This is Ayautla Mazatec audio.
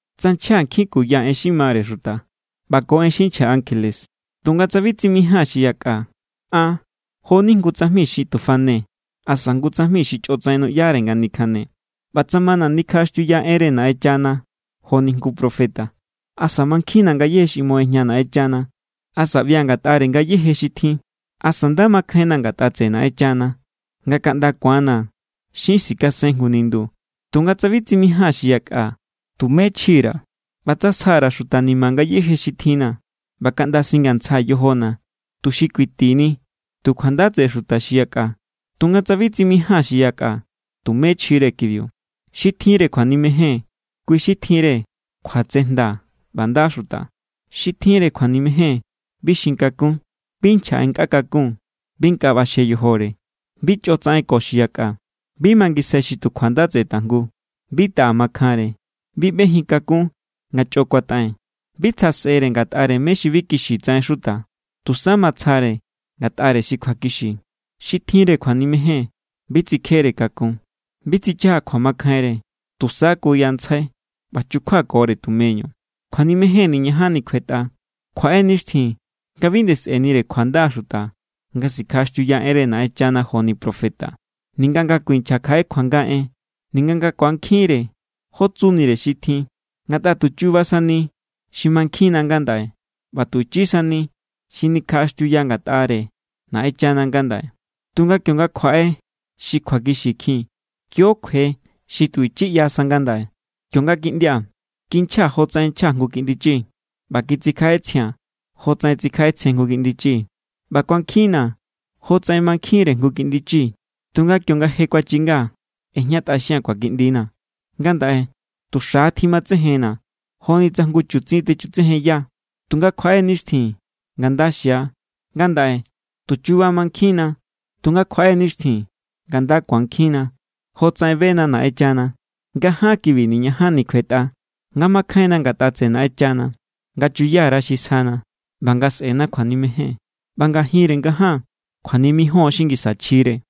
Tsa nchja nkjin kuya en xi mare xuta ꞌba ko en xi nchja ankjele, tunga tsa bi tsimijaa̱n xi yakꞌa, an jo=ni jngu tsajmi xi tu fane asa jngu tsajmi xi chꞌotsaꞌen nuꞌyare nga nikjane. ꞌBa tsa mana̱ nikjaꞌaxtiuya enre Naꞌenchana joni jngu profeta, asa mankjinna̱ ngayéje xi ꞌmo ꞌejña Naꞌenchana, asa ꞌbia̱ ngatꞌare ngayéje xi tjin, asa nda makjainna̱ ngatꞌa tseꞌe Naꞌenchana nga kaꞌnda ku̱anna̱ xin sikasen jngu nindu, tunga tsa bi tsimijaa̱n xi yakꞌa, tumé chji_ra̱. ꞌBa tsa sja_ra̱ xuta ni̱ma̱ ngayéje xi tjinna̱, ꞌba kaꞌnda singantsjaa̱ yojona̱ tuxi kuitini tu kjuanda tseꞌe xuta xi yakꞌa, tunga tsa bi tsimijaa̱n xi yakꞌa, tumé chjire kibiu. Xi tjinre kjuanimejen, kui xi tjinre kjuatsejnda ꞌba nda xuta. Xi tjinre kjuanimejen bi xin kakun, bi nchja en nkꞌa kakun, bi nkꞌa ꞌbaxje yojore, bi chꞌo tsaꞌen ko xi yakꞌa, bi mangisjai xi tu kjuanda tseꞌe tajngu, bi taꞌa makjanre, bi ꞌbejin kakun nga chꞌo kuataꞌen, bi tsja sꞌere ngatꞌare mé= xi bi kixi tsaꞌen xuta. Tusa matsjare ngatꞌare xi kjuakixi. Xi tjinre kjuanimejen bi tsikjere kakun, bi tsichaja kjuamakjainre, tusa kuyantsjai, ꞌba chukjuakore tumeñu. Kjuanimejen niñajanni kjuetꞌa. Kjuaꞌe nixtjin nga bi nde sꞌe̱nire kjuanda xuta nga sikjaꞌaxtiuya enre Naꞌenchana joni profeta, ninga nga kuinchja kjaꞌe kjuanga en, ninga nga ku̱ankjinre jó tsunire xi tjin. Ngatꞌa tu chuba sani xi mankjinna ngandaꞌe, ꞌba tu ichi sani xi nikjaꞌaxtiuya ngatꞌare Naꞌenchana ngandaꞌe. Tunga kionga kjuaꞌe xi kjuakixi kjin, kio= kjue xi tu ichi ꞌyasa ngandaꞌe. Kionga kiꞌndia̱, kinchjaa̱ jotsaꞌen nchja jngu kiꞌndi chi, ꞌba kitsikjaꞌetsjia̱n jotsaꞌen tsikjaꞌetsjen jngu kiꞌndi chi, ꞌba kuankjinna̱ jotsaꞌen mankjinre jngu kiꞌndi chi. Tunga kionga je kuachinga, ꞌejñatꞌaxia̱n kjuakiꞌndina̱. Ngandaꞌe tu xa̱= tjimatsejenna joni tsa jngu chutsin techutsejenya. Tunga kjuaꞌe nixtjin nga nda xia. Ngandaꞌe tu chuba mankjinna. Tunga kjuaꞌe nixtjin nga nda ku̱ankjinna, jofatsaꞌen bena Naꞌenchana. Ngaján kibi niñajanni kjuetꞌa: nga makjainna ngatꞌa tseꞌe Naꞌenchana, nga chuya_ra xi sjana, ꞌba nga sꞌena kjuanimejen. ꞌBa ngajinre ngaján, kjuanimijon xi ngisa chjire.